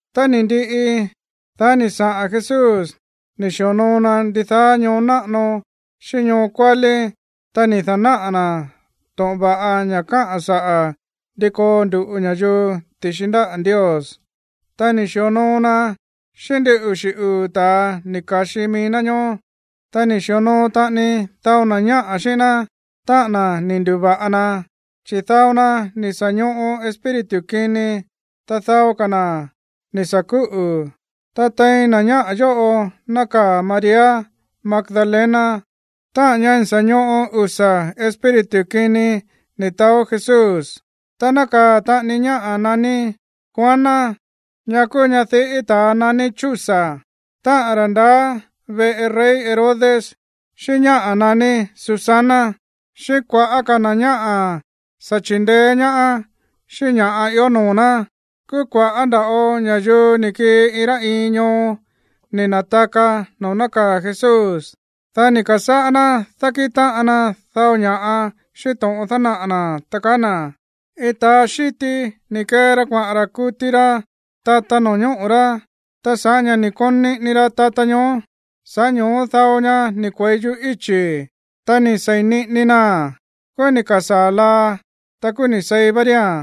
Tá ni̱ ndiꞌi, dá ni̱ saꞌa̱n Jesús ni̱ xi̱onoo na ndidaá ñoo náꞌano xíꞌín ñoo kuálí, ta ni̱ da̱náꞌa̱ na̱ to̱ꞌon va̱ꞌa ña̱ káꞌa̱n saꞌa̱ ndi koo ndu̱ꞌu ña̱yuu ti̱xi ndáꞌa̱ Ndios. Ta ni̱ xi̱onoo na xíꞌín ndin uxi̱ uu̱ ta̱a ni̱ ka̱xi mií ná ñoó. Ta ni̱ xi̱onoo taꞌani dao na̱ ñáꞌa̱ xíꞌín ná, táꞌa̱n na̱ ni̱ ndu̱va̱ꞌa na, chi̱ dao na ni̱ sa̱ ñoꞌo espíritu kini, ta dao ka̱ na̱ ni̱ sa̱ kúꞌu̱. Ta tein na̱ ñáꞌa̱ yóꞌo nákaa̱ María Magdalena, táꞌa̱n ñá sa̱ ñoꞌo usa̱ espíritu kini ni̱ taó Jesús. Ta nákaa̱ taꞌani ñáꞌa̱ naní Juana, ñá kúú ñadiꞌí ta̱a naní Chuza, táꞌa̱n ra̱ ndaá veꞌe rey Herodes, xíꞌín ñáꞌa̱ naní Susana, xíꞌín kua̱ꞌá ka̱ na̱ ñáꞌa̱ sa̱ chi̱ndeé ñaá xíꞌín ña̱ ió noo̱ ná. Kúú kua̱ꞌá nda̱ꞌo ña̱yuu ni̱ kii iin rá iin ñoo ni̱ na̱taka noo̱ nákaa̱ Jesús. Dá ni̱ ka̱sáꞌá ná dákíꞌin táꞌan na dao ña̱ꞌa xíꞌín to̱ꞌon dánaꞌa̱ na̱, ta kaá na̱: ―Iin ta̱a xíti ni̱ kee ra kuaꞌa̱n ra̱ kuti ra tata no̱ñóꞌo̱ rá. Ta sa̱ꞌá ña̱ ni̱ koon niꞌini ra tata ñoó, sa̱ꞌá ño̱ó dao ña ni̱ kue̱i yuꞌú íchi̱. Ta ni̱ sei̱n niꞌini naa̱n. Kúú ni̱ ka̱sáa̱ laa, ta kúú ni̱ seí vá ría̱n.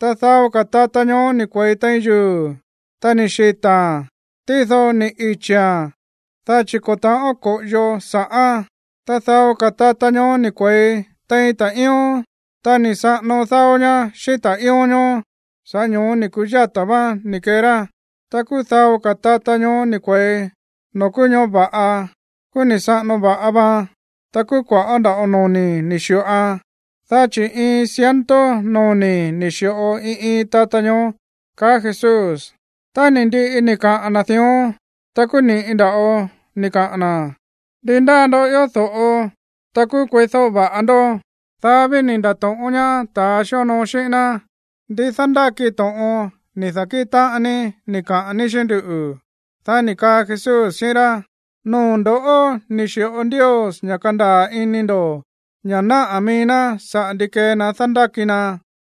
Ta dao ka̱ tata ñoó ni̱ kue̱i tein yuu̱, ta ni̱ xita̱a̱n. Tído ni̱ ichi̱a̱n, dá chi̱ ko̱ ta̱ꞌón ko̱ꞌoyo sa̱ꞌán. Ta dao ka̱ tata ñoó ni̱ kue̱i tein ta̱ꞌíón. Ta ni̱ saꞌano dáó ñá xíꞌín ta̱ꞌíón ñoó, sa̱ꞌá ño̱ó ni̱ ku̱yáta̱ váán ni̱ kee rá. Ta kúú dao ka̱ tata ñoó ni̱ kue̱i noo̱ kúú ñoꞌó va̱ꞌa. Kúú ni̱ saꞌano va̱ꞌa vaan. Ta kúú kua̱ꞌá ndava̱ꞌo noni̱ ni̱ xi̱ꞌoan, dá chi̱ iin ciento noni̱ ni̱ xi̱ꞌo iin iin tata ñoó ―kaá Jesús. Tá ni̱ ndiꞌi ni̱ kaꞌa̱n na̱ dión, ta kúú ni̱ꞌi nda̱ꞌo ni̱ kaꞌa̱n na̱: ―¡Ndi ndáa ndoꞌó ió do̱ꞌo, ta kúú kueídóꞌo va̱ꞌa ndó! Dá ví ni̱ nda̱to̱ꞌón ñaá ta̱a xíonoo xíꞌín ná: ―¿Ndí dándáki to̱ꞌon ni̱ da̱kíꞌin táꞌan ní ni̱ kaꞌa̱n ní xíꞌín nduꞌu̱? Dá ni̱ kaa Jesús xíꞌín rá: ―Noo̱ ndo̱ꞌó ni̱ xi̱ꞌo Ndios ña̱ kandaa̱ ini ndo̱ ña̱ náꞌá mií ná saꞌa̱ ndi kée na dándáki na.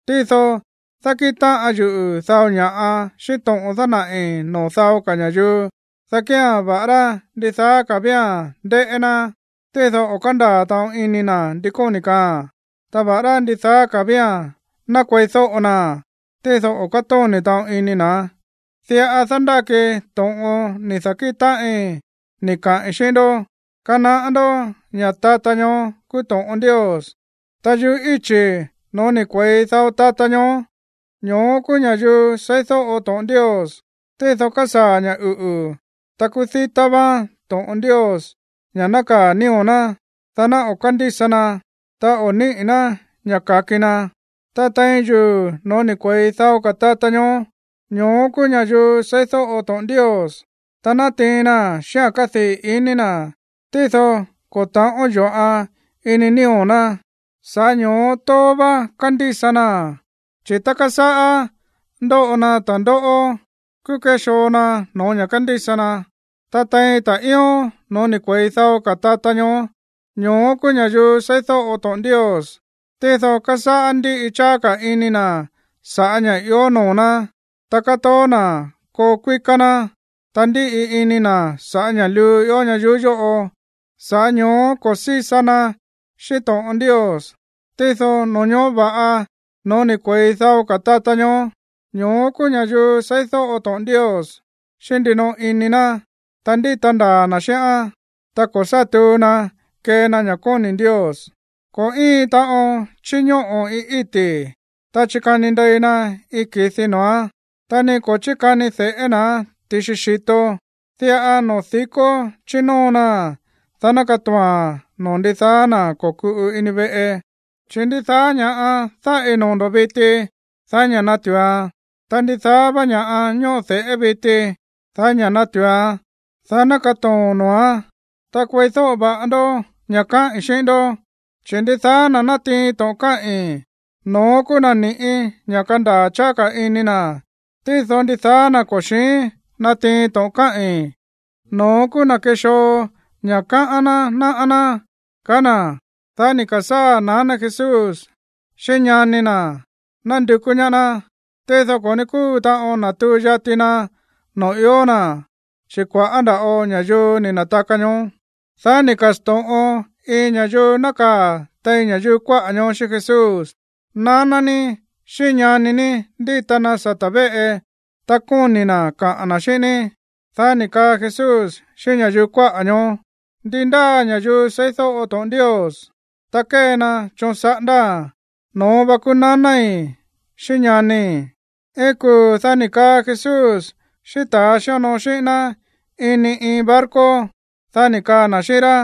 Tído dákíꞌin táꞌan yuꞌu̱ dao ña̱ꞌa xíꞌín to̱ꞌon dánaꞌi̱ noo̱ dao ka̱ ña̱yuu, dá kía̱n, va̱ꞌará ndidaá ka̱ vía̱n ndéꞌé ná, tído o̱ kándaa̱ taꞌon ini na̱ ndi kóni̱ kaaa̱n, ta va̱ꞌará ndidaá ka̱ vía̱n ná kueídóꞌo na, tído o̱ kátóni̱ taꞌon ini na̱. ’Diꞌa dándáki to̱ꞌon ni̱ da̱kíꞌin táꞌin ni̱ kaꞌi̱n xíꞌín ndó. Kanaꞌá ndó ña̱ tata ñoó kúú to̱ꞌon Ndios. Ta yuꞌú íchi̱ no̱ó ni̱ kue̱i dao tata ñoó, ño̱ó kúú ña̱yuu seídóꞌo to̱ꞌon Ndios, tído kásaa̱ ña̱ uꞌu̱, ta kúú dítá váán to̱ꞌon Ndios ña̱ nákaa̱ nío̱ ná, dá ná o̱ kándísa naa̱n, ta o̱ níꞌi̱ ná ña̱ ka̱ki na. Ta tein yuu̱ no̱ó ni̱ kue̱i dao ka̱ tata ñoó, ño̱ó kúú ña̱yuu seídóꞌo to̱ꞌon Ndios, ta nátiin naa̱n xíꞌa̱n kádii̱ iní na̱. Tído ko̱ ta̱ꞌón yo̱ꞌan ini nío̱ ná, sa̱ꞌá ño̱ó tóó vá kándísa naa̱n. Chi̱ tá kásáꞌá ndóꞌo na ta̱ndóꞌó, kúú kéxoo na no̱ó ña̱ kándísa na. Ta tein ta̱ꞌíón no̱ó ni̱ kue̱i dao ka̱ tata ñoó, ño̱ó kúú ña̱yuu seídóꞌo to̱ꞌon Ndios. Tído kásáꞌá ndíꞌi cháá ka̱ ini na̱ sa̱ꞌá ña̱ ió noo̱ ná, ta kátoó na̱ koo kuíká ná, ta ndíꞌi ini na̱ sa̱ꞌá ña̱ꞌa luu ió ñayuú yóꞌo. Sa̱ꞌá ño̱ó ko̱ sísa na xíꞌín to̱ꞌon Ndios. Tído no̱ñóꞌo̱ va̱ꞌa no̱ó ni̱ kue̱i dao ka̱ tata ñoó, ño̱ó kúú ña̱yuu seídóꞌo to̱ꞌon Ndios xíꞌín ndinoꞌo ini na̱, ta ndíta ndaa̱ na̱ xíꞌán. Ta ko̱ sá tuu na kée na ña̱ kóni̱ Ndios. ’Ko̱ íin taꞌon chíñóꞌo̱ iin íti̱, ta chíkani ndei na iin ki̱di noo̱án, ta ni ko̱ chíkani de̱ꞌé na̱án ti̱xi xi̱to. Diꞌa noo̱ di̱kó chínóo naa̱n, dá ná katoo̱a̱n noo̱ ndidaá na̱ ko̱kuꞌu ini veꞌe. Chi̱ ndidaá ña̱ꞌa dáꞌi noo̱ ndo̱ viti, daí ña̱ natu̱uan. Ta ndidaá vá ña̱ꞌa ñóꞌo de̱ꞌé viti, daí ña̱ natu̱uan, dá ná katoo̱n noo̱án. Ta kueídóꞌo va̱ꞌa ndó ña̱ káꞌi̱n xíꞌín ndó, chi̱ ndidaá na̱ natiin to̱ꞌon káꞌi̱n, no̱ón kúú na̱ ni̱ꞌí ña̱ kandaa̱ cháá ka̱ ini na̱. Tído ndidaá na̱ ko̱ xi̱ín natiin to̱ꞌon káꞌi̱n, no̱ón kúú na̱ kexoo ña̱ káꞌán ná náꞌá ná ―kaá na̱. Dá ni̱ ka̱sáa̱ naná Jesús xíꞌín ñani na̱ nándukú ñaá ná. Tído ko̱ ní kúu taꞌon natuu yati na noo̱ ió na̱, chi̱ kua̱ꞌá nda̱ꞌo ña̱yuu ni̱ na̱taka ñoó. Dá ni̱ ka̱sto̱ꞌon iin ña̱yuu nákaa̱ tein ña̱yuu kuáꞌa̱ ñoó xíꞌín Jesús: ―Naná ní xíꞌín ñani ní ndíta na sata̱ véꞌe, ta kóni̱ na̱ kaꞌa̱n na̱ xíꞌín ní. Dá ni̱ kaa Jesús xíꞌín ña̱yuu kuáꞌa̱ ñoó: ―Ndi ndáa ña̱yuu seídóꞌo to̱ꞌon Ndios, ta kée na choon saꞌándáa̱n, no̱ón vá kúú nanái̱ xíꞌín ñanii̱. Iin kuu̱, dá ni̱ kaa Jesús xíꞌín ta̱a xíonoo xíꞌín ná ini iin barco. Dá ni̱ kaa na̱ xíꞌín rá: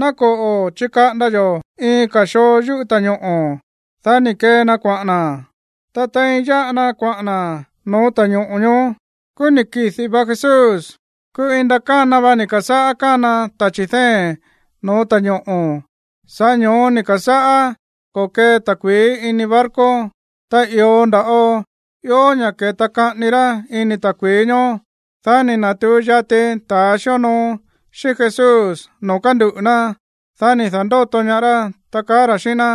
―Ná koꞌo̱ chikaꞌanda yo̱ iin ka̱ xoo yuꞌú ta̱ñoꞌo̱. Dá ni̱ kee na kuaꞌa̱n na̱. Ta tein yáꞌa na kuaꞌa̱n na̱ no̱ó ta̱ñoꞌo̱ ñoó, kúú ni̱ kidi̱ va Jesús. Kúú iin ndakána va ni̱ ka̱sáꞌá kána tachi̱ dée̱n no̱ó ta̱ñoꞌo̱. Sa̱ꞌá ño̱ó ni̱ ka̱sáꞌá ko̱kee ta̱kui̱í ini barco. Ta i̱o nda̱ꞌo ió ña̱ ke̱ta kaꞌani ra ini ta̱kui̱í ñoó. Dá ni̱ na̱tuu yati ta̱a xíonoo xíꞌín Jesús noo̱ kánduꞌu̱ ná. Dá ni̱ da̱ndóto ñaá rá, ta kaá ra̱ xíꞌín ná: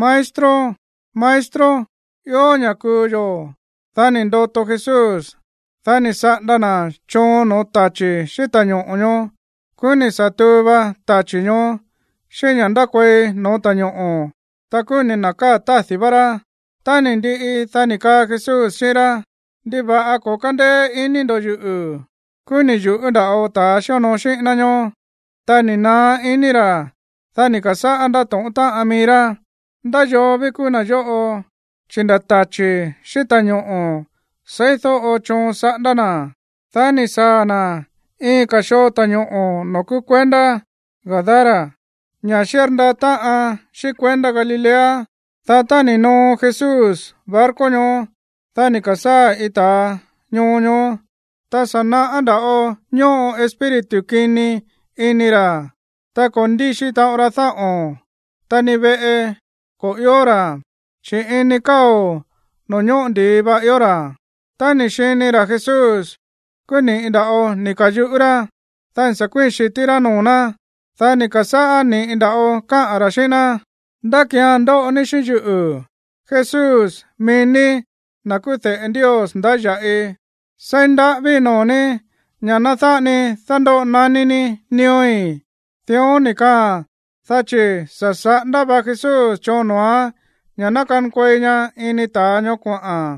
―¡Maestro! ¡Maestro! ¡Ió ña̱ kuu yo̱! Dá ni̱ ndoto Jesús. Dá ni̱ saꞌanda na̱ choon no̱ó tachi̱ xíꞌín ta̱ñoꞌo̱ ñoó. Kúú ni̱ sa̱ tuu va tachi̱ ñoó xíꞌín ña̱ ndákuei no̱ó ta̱ñoꞌo̱, ta kúú ni̱ na̱káa̱ tádi̱ vá rá. Tá ni̱ ndiꞌi, dá ni̱ kaa Jesús xíꞌín rá: ―¿Ndiva̱ꞌa ko̱ kándéé iní ndo̱ yuꞌu̱? Kúú ni̱ yu̱ꞌú nda̱ꞌo ta̱a xíonoo xíꞌín ná ñóó, ta ni̱ naá iní ra̱. Dá ni̱ ka̱sáꞌá ndátóꞌón táꞌan míí rá: ―¿Ndá yoo ví kúú na̱ yóꞌo, chi̱ nda̱ tachi̱ xíꞌín ta̱ñoꞌo̱ seídóꞌo choon saꞌándá na̱? Dá ni̱ saa̱ na̱ iin ka̱ xoo ta̱ñoꞌo̱ noo̱ kúú kuendá Gadara, ña̱ xírndaa táꞌan xíꞌín kuendá Galilea. Dá tá ni̱ noo Jesús barco ñoó, dá ni̱ ka̱sáa̱ iin ta̱a ñoo ñoó, ta sa̱ naꞌá nda̱ꞌo ñóꞌo espíritu kini ini ra̱, ta ko̱ ndíxi taꞌon ra dáꞌo̱n, ta ni veꞌe ko̱ ió ra̱, chi̱ ini káo̱ noo̱ ñóꞌo ndi̱i va ió ra̱. Tá ni̱ xini ra̱ Jesús, kúú ni̱ꞌi nda̱ꞌo ni̱ ka̱yuꞌú rá. Dá ni̱ sa̱ kuíi̱n xi̱tí rá noo̱ ná, dá ni̱ ka̱sáꞌá ni̱ꞌi nda̱ꞌo káꞌa̱n ra̱ xíꞌín ná: ―¿Ndá ki̱án ndóꞌo ní xíꞌín yuꞌu̱, Jesús, mií ní na̱ kúú de̱ꞌe Ndios ndáya̱ꞌi? Seí ndaꞌávíi̱ noo̱ ní ña̱ ná dáꞌa ni dándóꞌo naní ní nío̱í. Dión ni̱ kaaa̱n, dá chi̱ sa̱ saꞌanda va Jesús choon noo̱án ña̱ ná kankuei ña ini ta̱a ñoó koꞌa̱n.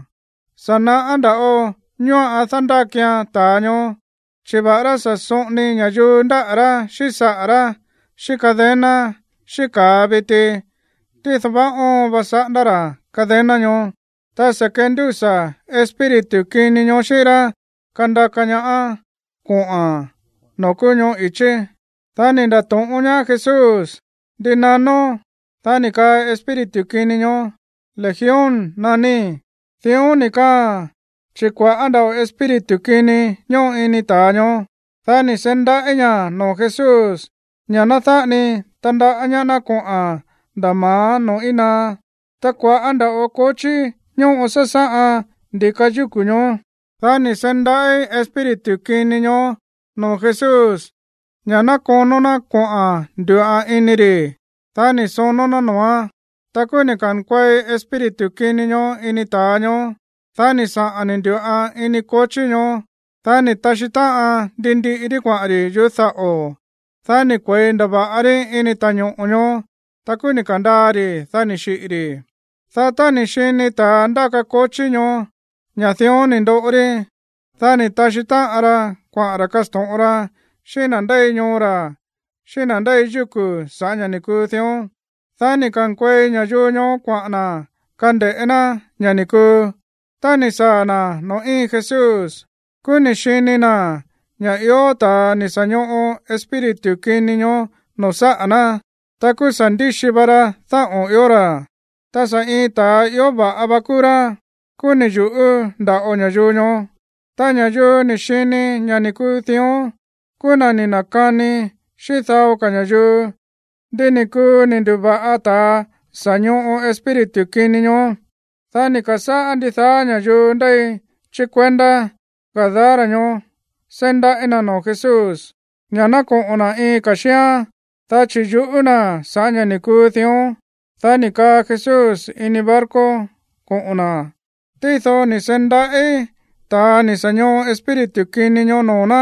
Sa̱ naꞌá nda̱ꞌo ñóꞌan dándákian ta̱a ñoó. Chi̱ va̱ꞌará sa̱ soꞌoni ña̱yuu ndáꞌa̱ rá xíꞌín saꞌa̱ rá xíꞌín cadena xíꞌín ka̱a viti, tído vaá óon va saꞌándá ra̱ cadena ñoó. Ta sa̱ kendúsa̱ espíritu kini ñoó xíꞌín rá kandaka ñaáán kuaꞌa̱n noo̱ kúú ñoꞌó i̱chí. Dá ni̱ nda̱to̱ꞌón ñaá Jesús: ―¿Ndi nanón? Dá ni̱ kaa espíritu kini ñoó: ―Legión naníí. Dión ni̱ kaaa̱n chi̱ kua̱ꞌá nda̱ꞌo espíritu kini ñóꞌo ini ta̱a ñoó. Dá ni̱ seí ndaꞌí ña̱ noo̱ Jesús ña̱ ná dáꞌa ni tandaꞌá ñaá ná koꞌa̱n nda̱ ma̱á noo̱ íin naá. Ta kua̱ꞌá nda̱ꞌo kochí ñóꞌo sásáꞌan ndi̱ka yúku̱ ñoó. Dá ni̱ seí ndaꞌí espíritu kini ñoó noo̱ Jesús ña̱ ná konó ná koꞌa̱n ndu̱ꞌan ini ri̱. Dá ni̱ sonó ná noo̱án. Ta kúú ni̱ ka̱nkuei espíritu kini ñoó ini ta̱a ñoó. Dá ni̱ saꞌa̱n ni̱ ndu̱ꞌan ini kochí ñoó. Dá ni̱ taxí táꞌan ndi ndiꞌi rí kuaꞌa̱n ri̱ yuꞌú daꞌo̱. Dá ni̱ kue̱i ndava̱ꞌa rí ini ta̱ñoꞌo̱ ñoó. Ta kúú ni̱ ka̱ndaa ri̱, dá ni̱ xiꞌi̱ ri̱. Dá tá ni̱ xini ta̱ ndáka kochí ñoó ña̱ dión ni̱ ndoꞌo rí, dá ni̱ taxí táꞌan ra kuaꞌa̱n ra̱ kasto̱ꞌon ra xíꞌín na̱ ndéi ñoo ra̱ xíꞌín na̱ ndéi yúku̱ sa̱ꞌá ña̱ ni̱ kuu dión. Dá ni̱ ka̱nkuei ña̱yuu ñoó kuaꞌa̱n na̱ kande̱ꞌé ná ña̱ ni̱ kuu. Tá ni̱ saa̱ na̱ noo̱ íin Jesús, kúú ni̱ xini na̱ ña̱ ió ta̱a ni̱ sa̱ ñoꞌo espíritu kini ñoó noo̱ sáꞌa̱ ná. Ta kúú sa̱ ndíxi va ra dáꞌo̱n ió ra̱. Ta sa̱ iin ta̱a ió va̱ꞌa vá kúú rá. Kúú ni̱ yu̱ꞌú nda̱ꞌo ña̱yuu ñoó. Ta ña̱yuu ni̱ xini ña̱ ni̱ kuu dión kúú na̱ ni̱ na̱kani xíꞌín dao ka̱ ña̱yuu ndi ni̱ kuu ni̱ ndu̱va̱ꞌa ta̱a sa̱ ñoꞌo espíritu kini ñoó. Dá ni̱ ka̱sáꞌá ndidaá ña̱yuu ndéi chí kuendá Gadara ñoó seí ndaꞌí na̱ noo̱ Jesús ña̱ ná koꞌo̱n na̱ iin ka̱ xíán, dá chi̱ yuꞌú na̱ sa̱ꞌá ña̱ ni̱ kuu dión. Dá ni̱ kaa Jesús ini barco koꞌo̱n na̱. Tído ni̱ seí ndaꞌí ta̱a ni̱ sa̱ ñoꞌo espíritu kini ñoó noo̱ ná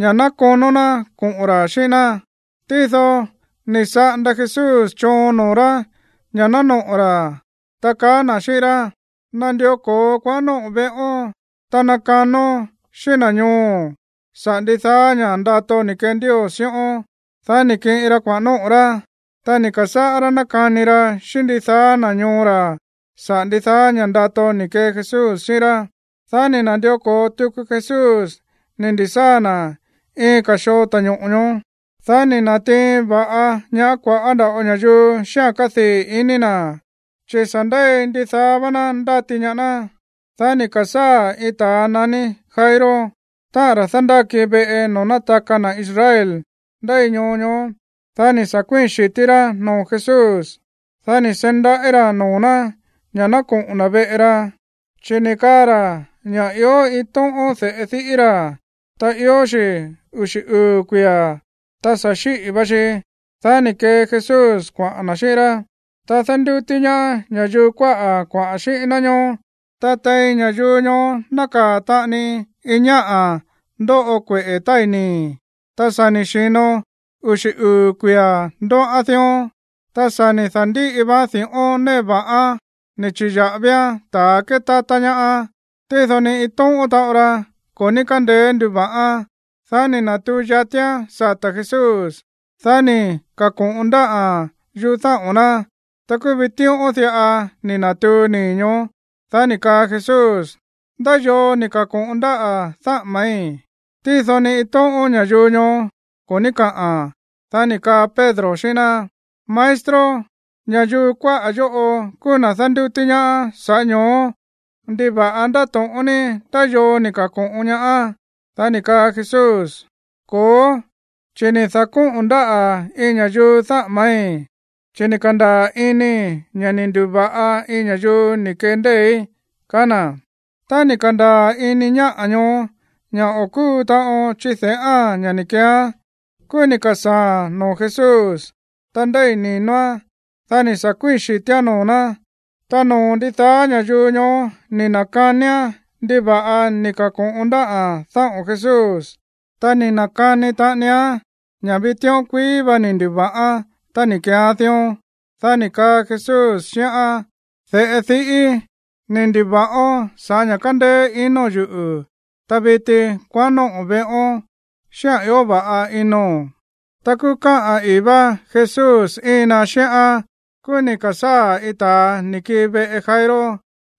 ña̱ ná konó ná koꞌo̱n ra̱ xíꞌín ná. Tído ni̱ saꞌanda Jesús choon noo̱ rá ña̱ ná noꞌo̱ ra̱, ta kaá na̱ xíꞌín rá: ―Nandió ko̱o kuaꞌa̱n nóꞌo̱n veꞌón, ta nakanón xíꞌín na̱ ñooo̱n saꞌa̱ ndidaá ña̱ꞌa ndato ni̱ kee Ndios xíꞌón. Dá ni̱ kiꞌin ra kuaꞌa̱n nóꞌo̱ rá. Ta ni̱ ka̱sáꞌá rá nákani ra xíꞌín ndidaá na̱ ñoo ra̱ saꞌa̱ ndidaá ña̱ꞌa ndato ni̱ kee Jesús xíꞌín rá. Dá ni̱ na̱ndió ko̱o tuku Jesús ni̱ ndi̱sáa̱ na̱ iin ka̱ xoo ta̱ñoꞌo̱ ñoó. Dá ni̱ na̱tiin va̱ꞌa ñaá kua̱ꞌá nda̱ꞌo ña̱yuu xíꞌa̱n kádii̱ ini na̱, chi̱ sa̱ ndéi ndidaá vá ná ndáti ñaá ná. Dá ni̱ ka̱sáa̱ iin ta̱a naní Jairo, táꞌa̱n ra̱ dándáki veꞌe noo̱ nátaka na̱ Israel ndéi ñoo ñoó. Dá ni̱ sa̱ kuíi̱n xi̱tí rá noo̱ Jesús. Dá ni̱ seí ndaꞌí ra̱ noo̱ ná ña̱ ná koꞌo̱n na̱ veꞌe ra, chi̱ ni̱ kaa ra̱ ña̱ ió iin tóꞌón de̱ꞌe diꞌí ra̱, ta ió xi̱ uxi̱ uu̱ kuia̱, ta sa̱ xíꞌi̱ va xi. Dá ni̱ kee Jesús kuaꞌa̱n na̱ xíꞌín rá, ta dándútí ñaá ña̱yuu kuáꞌa̱ kuaꞌa̱n xíꞌín ná ñoó. Ta tein ña̱yuu ñoó nákaa̱ taꞌani iin ñáꞌa̱ ndóꞌo kueꞌe̱ tái̱ nii̱, ta sa̱ ni̱ xi̱no uxi̱ uu̱ kuia̱ ndóꞌán dión. Ta sa̱ ni̱ da̱ndíꞌi vaan di̱ꞌón néꞌe va̱ꞌán ni̱ chi̱ya̱ꞌavián ta̱ kétátá ñaá. Tído ni iin tóꞌón taꞌon ra ko̱ ní kándeé nduva̱ꞌán. Dá ni̱ na̱tuu yatián sata̱ Jesús. Dá ni̱ ka̱ko̱ꞌon ndáꞌa̱n yuꞌú dáꞌo̱n ná. Ta kúú vitíꞌón diꞌa ni̱ na̱tuu nii̱ ñoó. Dá ni̱ kaa Jesús: ―¿Ndá yoo ni̱ ka̱ko̱ꞌon ndáꞌa̱ dáꞌa̱ma̱í? Tído ni iin tóꞌón ña̱yuu ñoó ko̱ ní kaꞌa̱n. Dá ni̱ kaa Pedro xíꞌín ná: ―Maestro, ña̱yuu kuáꞌa̱ yóꞌo kúú na̱ dándútí ñaá. Sa̱ꞌá ño̱ó, ¿ndiva̱ꞌa ndáto̱ꞌón ní ndá yoo ni̱ ka̱ko̱ꞌon ñaá? Dá ni̱ kaa Jesús: ―Ko̱ó, chi̱ ni̱ da̱kóꞌo̱n ndáꞌa̱ iin ña̱yuu dáꞌa̱ma̱í, chi̱ ni̱ ka̱ndaa̱ inii̱ ña̱ ni̱ ndu̱va̱ꞌa iin ña̱yuu ni̱ kee ndée̱í ―kaá na̱. Tá ni̱ ka̱ndaa̱ ini ñáꞌa̱ ñoó ña̱ o̱ kúu taꞌon chide̱ꞌáa̱n ña̱ ni̱ keeán, kúú ni̱ ka̱sáa̱a̱n noo̱ Jesús, ta ndéi̱ ni̱noán. Dá ni̱ sa̱ kuíi̱n xi̱tíán noo̱ ná. Ta noo̱ ndidaá ña̱yuu ñoó ni̱ na̱kanián ndiva̱ꞌa ni̱ ka̱ko̱ꞌon ndáꞌa̱n dáꞌo̱n Jesús, ta ni̱ na̱kani taꞌanián ña̱ vitíꞌón kuií vá ni̱ ndu̱va̱ꞌán tá ni̱ keeán dión. Dá ni̱ kaa Jesús xíꞌán: ―De̱ꞌe diꞌíi̱, ni̱ ndu̱va̱ꞌón sa̱ꞌá ña̱ kándéé inóo̱n yuꞌu̱. Ta viti, kuaꞌán nóꞌo̱n veꞌón xíꞌa̱n ió va̱ꞌa inóo̱n. Ta kúú káꞌa̱n ii̱ vá Jesús íin na xíꞌán, kúú ni̱ ka̱sáa̱ iin ta̱a ni̱ kii veꞌe Jairo,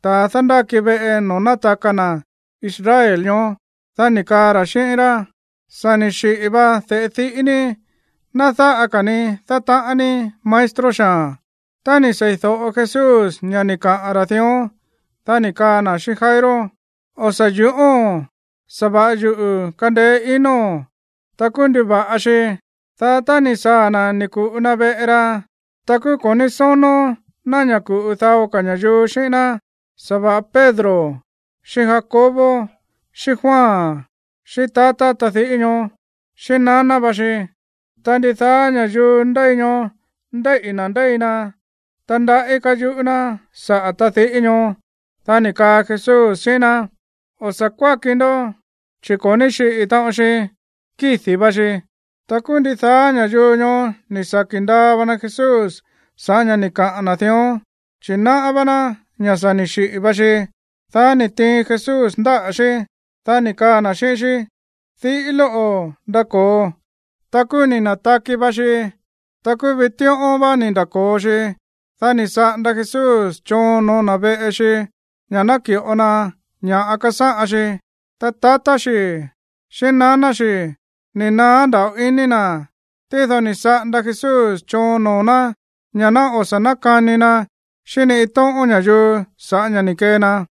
ta̱ dándáki veꞌe noo̱ nátaka na̱ Israel ñoó, dá ni̱ kaa ra̱ xíꞌín rá: ―Sa̱ ni̱ xiꞌi̱ va de̱ꞌe diꞌí ní. Ná dáꞌa ka̱ ni dátaꞌán ní maestro xaa̱n. Tá ni̱ seídóꞌo Jesús ña̱ ni̱ kaꞌa̱n ra̱ dión, dá ni̱ kaa na̱ xíꞌín Jairo: ―O̱ sa̱ yu̱ꞌóo̱n. Sa̱va̱ꞌa yuꞌu̱ kandeé inóo̱n, ta kúú nduva̱ꞌa xi. Dá tá ni̱ saa̱ na̱ ni̱ ku̱ꞌu na veꞌe ra, ta ko̱ ní sónó ná ña̱ ku̱ꞌu dao ka̱ ña̱yuu xíꞌín ná, sa̱va̱ꞌa Pedro xíꞌín Jacobo, xíꞌín Juan xíꞌín tatá tadiꞌí ñóó, xíꞌín naná va xi. Ta ndidaá ña̱yuu ndéi ñoó ndéíꞌi̱ na̱ ndéi na, ta ndaꞌí káyuꞌú ná saꞌa̱ tadiꞌí ñóó. Dá ni̱ kaa Jesús xíꞌín ná: ―O̱ sa̱ kuáki ndó, chi̱ ko̱ ní xiꞌi̱ taꞌon xi, kídi̱ va xi. Ta kúú ndidaá ña̱yuu ñoó ni̱ saki̱ ndaa va na Jesús sa̱ꞌá ña̱ ni̱ kaꞌa̱n na̱ dión, chi̱ náꞌá vá ná ña̱ sa̱ ni̱ xiꞌi̱ va xi. Dá ni̱ tiin Jesús ndáꞌa̱ xí, dá ni̱ kaa na̱ xíꞌín xí: ―Diꞌí lóꞌo̱, ndako̱o. Ta kúú ni̱ na̱taki va xi. Ta kúú vitíꞌón vá ni̱ nda̱ko̱o xi. Dá ni̱ saꞌanda Jesús choon no̱ó na̱ veꞌe xi ña̱ ná ki̱ꞌo na ña̱ꞌa kasáꞌan xi. Ta tatá xi̱ xíꞌín naná xi̱ ni̱ naá nda̱ꞌo ini na̱. Tído ni̱ saꞌanda Jesús choon noo̱ ná ña̱ ná o̱ sa̱ nákani na xíꞌín ni iin tóꞌón ña̱yuu sa̱ꞌá ña̱ ni̱ kee na.